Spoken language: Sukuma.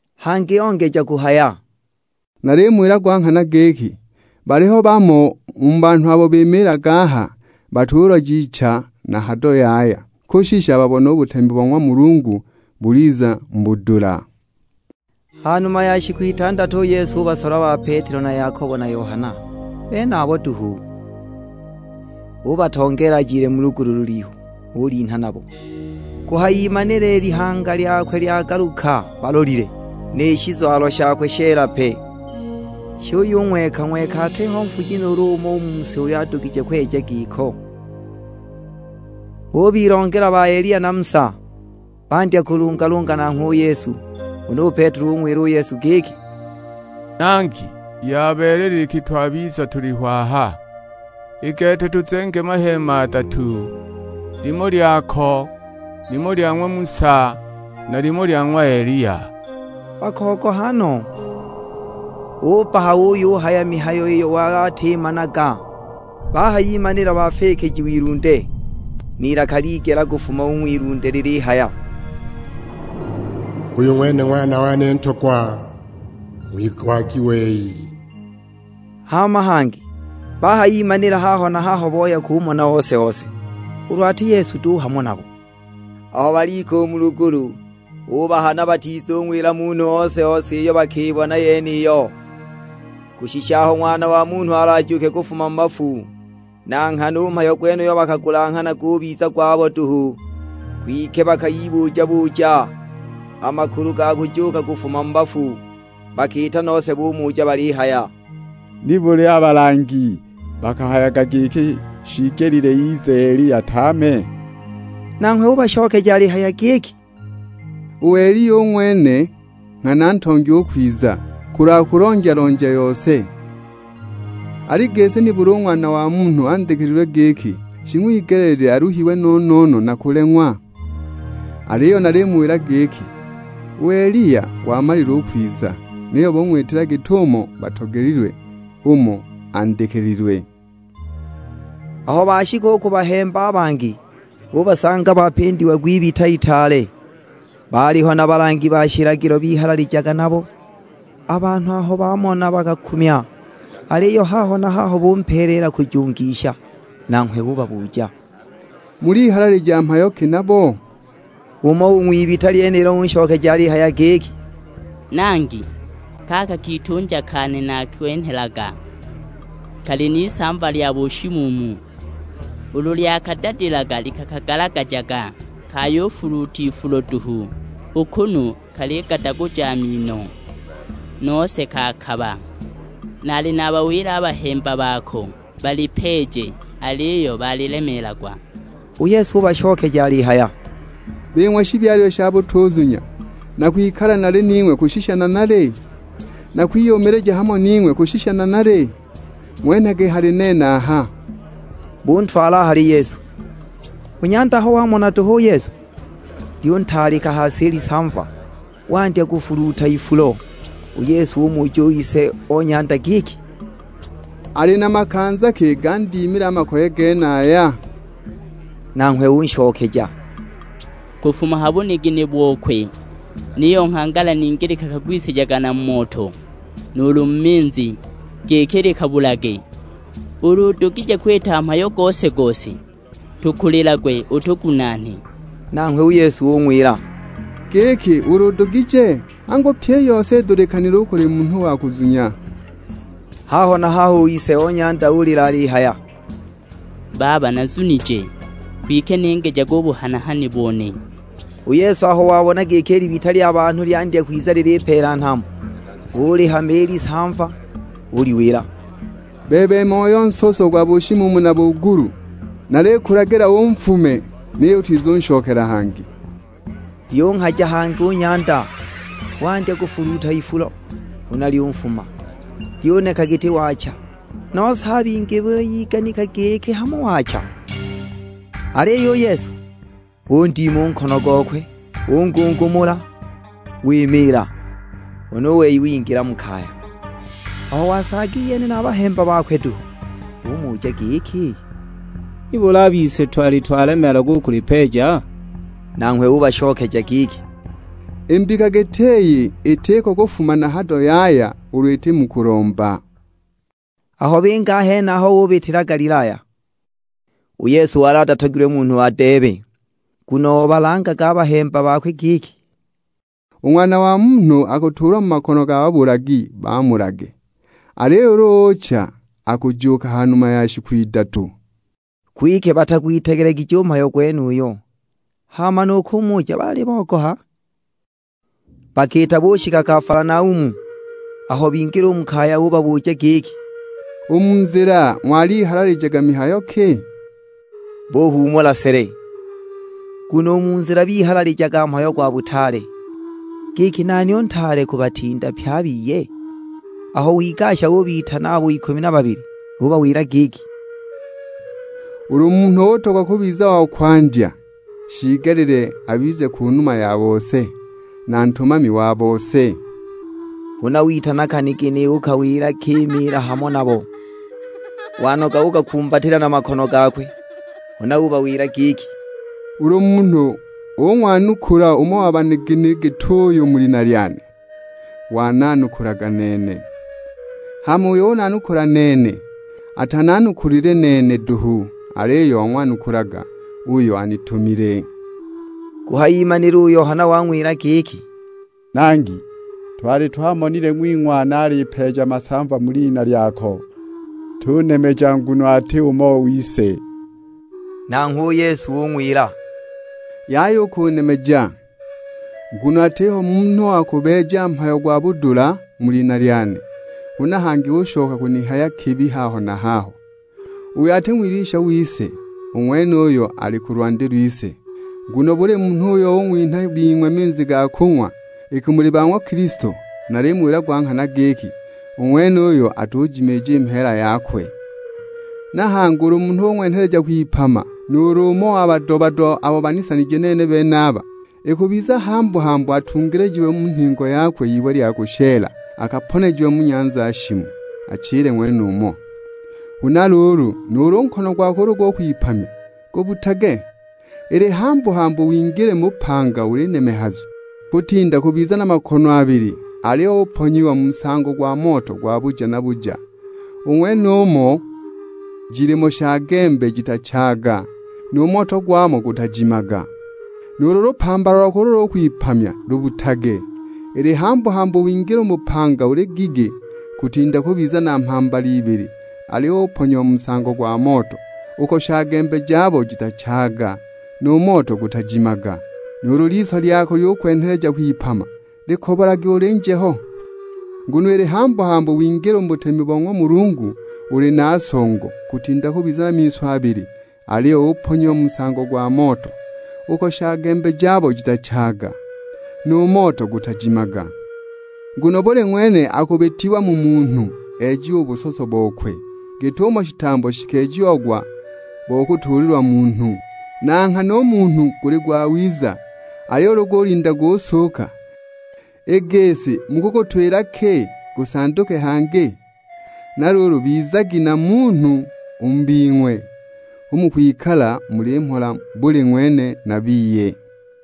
Hangi ongeja kuhaya, "Nalimuwila gwa nghana giki, baliho bamo u mu banhu abo bimiilaga aha batuloja icha na hado yaya, kushisha babubone u butemi bo ng'wa Mulungu buliza mu budula." Ha numa ya shiku itandatu u Yesu ubasola ba Petelo na Yakobo na Yohana, benabo duhu, ubatongeela ajile mu lugulu lulihu, ulinha nabo. Kuhayimanila i lihanga lyakwe lyagaluka balolile. Ni shizwalo shakwe sheela pe, shiyung'weka-ng'weka; atiho nfuji nuulu umo u mu si uyo adugije kweja giko. Bubilongela ba Eliya na Musa, bandya kulungalunga nanghwe u Yesu. Huna u Petelo ung'wila u Yesu giki, "Nangi, yabeelela iki twabiza tuliho aha, i gete tuzenge maheema adatu, limo lyako, limo lya ng'wa Musa, na limo lya ng'wa Eliya." Bakogoha no, ubbaha uyuhaya mihayo iyo wali atimanaga. Bahayimanila bafikijiwa ilunde, n'ilaka ligela kufuma u ng'wilunde lilihaya, "Uyu ng'wene Ng'wana wane Ntogwa, ng'wigwagi wei." Hama hangi bahayimanila haho na haho boya kumona ose-ose, ulu ati Yesu duhu hamo nabo. Aho balika u mu lugulu, ubahana batizung'wila munhu ose-ose iyo bakibona yeniyo, kushisha aho Ng'wana wa Munhu alajuuke kufuma mu bafu. Na nghana u mhayo gwenuyo bakagulanghana gubiza gwabo duhu, kwike bakayibuja-buja a makulu ga kujuuka kufuma mu bafu. Bakiita nose bumuja balihaya, "Nibuli a balangi bakahayaga giki, shiigelile ize Eliya tame?" Nanghwe ubashokeja alihaya giki, "U Eliya u ng'wene nghana ntongi u kwiza, kulwa kulonja-lonja yose. Al'i gisi nibuli u Ng'wana wa Munhu andikililwe giki, shing'wigeleelilwe aluhiwe no-no-no, na kuleng'wa? Aliyo nalimuwila giki, u Eliya wamalile u kwiza, niyo bung'witila git'umo batogelilwe; umo andikililwe!" Aho bashika u ku bahemba a bangi, bubasanga bapindiagwa ibita itaale; baaliho na balangi ba shilagilo bihalalijaga nabo. A banhu aho bamona bakakumya, aliyo haho na haho bumpeeleela kujungisha. Nanghwe ubabuja, "Mulihalalija mhayo ki nabo?" Umo u ng'wibita lyenilo unshokeja alihaya giki, "Nangi, kaka kitunja kane nakwenhelaga, kali n'isamva lya bushimuumu. Ulu lyakadadila likakagalagajaga, kayufuluuta ifulo duhu, u kunu kaligadaguja a mino, nose kaakaba! Naali nabawila a bahemba bako balipeeje, aliyo balilemeelagwa!" U Yesu ubashokeja alihaya, "Bing'we shibyalilwe sha butuzunya, nakwikala nali ning'we kushisha nanali? Nakwiyumilija hamo ning'we kushisha nanali? Ng'wenhagi hali nene aha!" Buntwala a hali Yesu. U nyanda aho wamona duhu u Yesu, lyuntaalika ha si i lisamva, wandya kufuluuta ifulo. U Yesu umuja u ise o nyanda giki, "Ali na makanza ki gandimile a makoye genaya?" Nanghwe unshokeja, "Kufuma ha bunigini bokwe. Niyo nghangala ningi likakagwisijaga na mu moto, nuulu mu minzi, giki likabulage. Ulu udugije kwita mhayo gose-gose, tukulilagwe utugunaane!" Nanghwe u Yesu ung'wila, "Giki ulu udugije? Angu pyi i yose idulikanile u kuli munhu wa kuzunya!" Haho na haho u ise o nyanda ulila alihaya, "Baba nazunije, kwike ningijage u buhana-hani bone!" U Yesu aho wabona giki i libita lya banhu lyandya kwiza lilipeela nhambo, ulihama i lisamva, uliwila, "Bebe moyo nsoso gwa bushimuumu na bugulu, nalikulagila unfume, niyo utizunshokela hangi." Lyunghaja hangi u nyanda, wandya kufuluuta ifulo, huna lyunfuma, lyuneka giti waacha, nose a bingi buyiganika giki hamo waacha. Aliyo u Yesu, undima u nkono gokwe, ungungumula, wimiila. Huna u wei wingila mu kaya. Aho wasaaga iyene na bahemba bakwe duhu, bumuja giki, "Nibuli a bise twali twalemeelagwa u kulipeeja?" Nanghwe ubashokeja giki, "I mbika giti iyi itiko kufuma na hado yaya ulu iti mu kulomba." Aho binga a henaho bubitila Galilaya. U Yesu wali atatogilwe munhu adeebe. Nguno obalangaga a bahemba bakwe giki, "U Ng'wana wa Munhu akutuulwa mu makono ga babulagi bamulage, aliyo ulu ucha akujuuka ha numa ya shiku idatu." Kwike batagwitegelegije u mhayo gwenuyo, hama nu kumuja baali bogoha. Bakiita bushika Kafalanaumu, aho bingila mu kaya ubabuja giki, "U mu nzila ng'walihalalijaga mihayo ki?" Buhuumula sele, nguno u mu nzila bihalaligijaga mhayo gwa butaale; giki nani u ntaale kubatinda pye a biye. Aho wigasha ubitana abo ikumi na babili, ubawila giki, "Ulu munhu utogwa kubiza wa kwandya, shiigelile abize ku numa ya bose, na ntumami wa bose." Huna witana kanigini ukawila kimiila hamo nabo, wanoga ukakumbatila na makono gakwe. Huna ubawila giki, "Ulu munhu ung'wanukula umo wa banigini git'uyu mu lina lyane, wananukulaga nene. Hama uyo unanukula nene, atananukulile nene duhu, aliyo wang'wanukulaga uyo anitumile." Kuhayimanila u Yohana wang'wila giki, "Nangi, twali twamonile ng'wing'wana alipeeja masamva mu lina lyako; tunemeja nguno ati umo wise!" Nanghwe u Yesu ung'wila, "Yaya u kunemeja, nguno atiho munhu wa kubeeja mhayo gwa budula mu lina lyane, huna hangi ushoka kunihaya kibi haho na haho. Uyo ati ng'wilwisha wise, u ng'wenuyo ali ku lwandi lwise. Nguno buli munhu uyo ung'winha a bing'we minzi ga kung'wa, iki muli ba ng'wa Kilisto, nalimuwila gwa nghana giki, u ng'wenuyo atujimiija i mheela yakwe." "Na hangi ulu munhu ung'wenheleja kwipama nuulu umo wa bado-bado abo banisanije nene benaba, ikubiza hambu-hambu atungilijiwe u mu nhingo yakwe iwe lya kushela, akaponejiwe mu nyanza shimu, achile ng'wenumo. Huna luulu, nuulu nkono gwako ulu gukwipamya, gubbutage, ili hambu-hambu wingile u mu bupanga uli nemehazu, kutinda kubiza na makono abili aliyo uponyiwa mu nsango gwa moto gwa buja na buja. [ U ng'wenumo jilimo shagembe jitachaaga, nu moto gwamo gutajimaga.] Nuulu lupambala lwako ulu lukwipamya lubbutage, ili hambu-hambu wingile u mu bupanga uli gigi, kutinda kubiza na mhambala ibili, aliyo uponyiwa mu nsango gwa moto, [ uko shagembe jabo jitachaaga, nu moto gutajimaga.] Nuulu liso lyako lyukwenheleja kwipama, likobolage ulyinje ho. Nguno ili hambu-hambu wingile u mu butemi bo ng'wa Mulungu uli na songo, kutinda kubiza na miso abili aliyo uponyiwa mu nsango gwa moto. Uko shagembe jabo jitachaaga, nu moto gutajimaga! Nguno buli ng'wene akubitiwa mu munhu ejiwe u busoso bokwe, git'umo shitambo shikeejiagwa bo kutuulilwa munhu. Na nghana u munhu guli ng'wiza, aliyo ulu gulinda gusuuka, i gisi mukugutwila ki gusanduke hangi? Na luulu bizagi na munhu u mu bing'we, hu mukwikala muli mhola buli ng'wene na biye."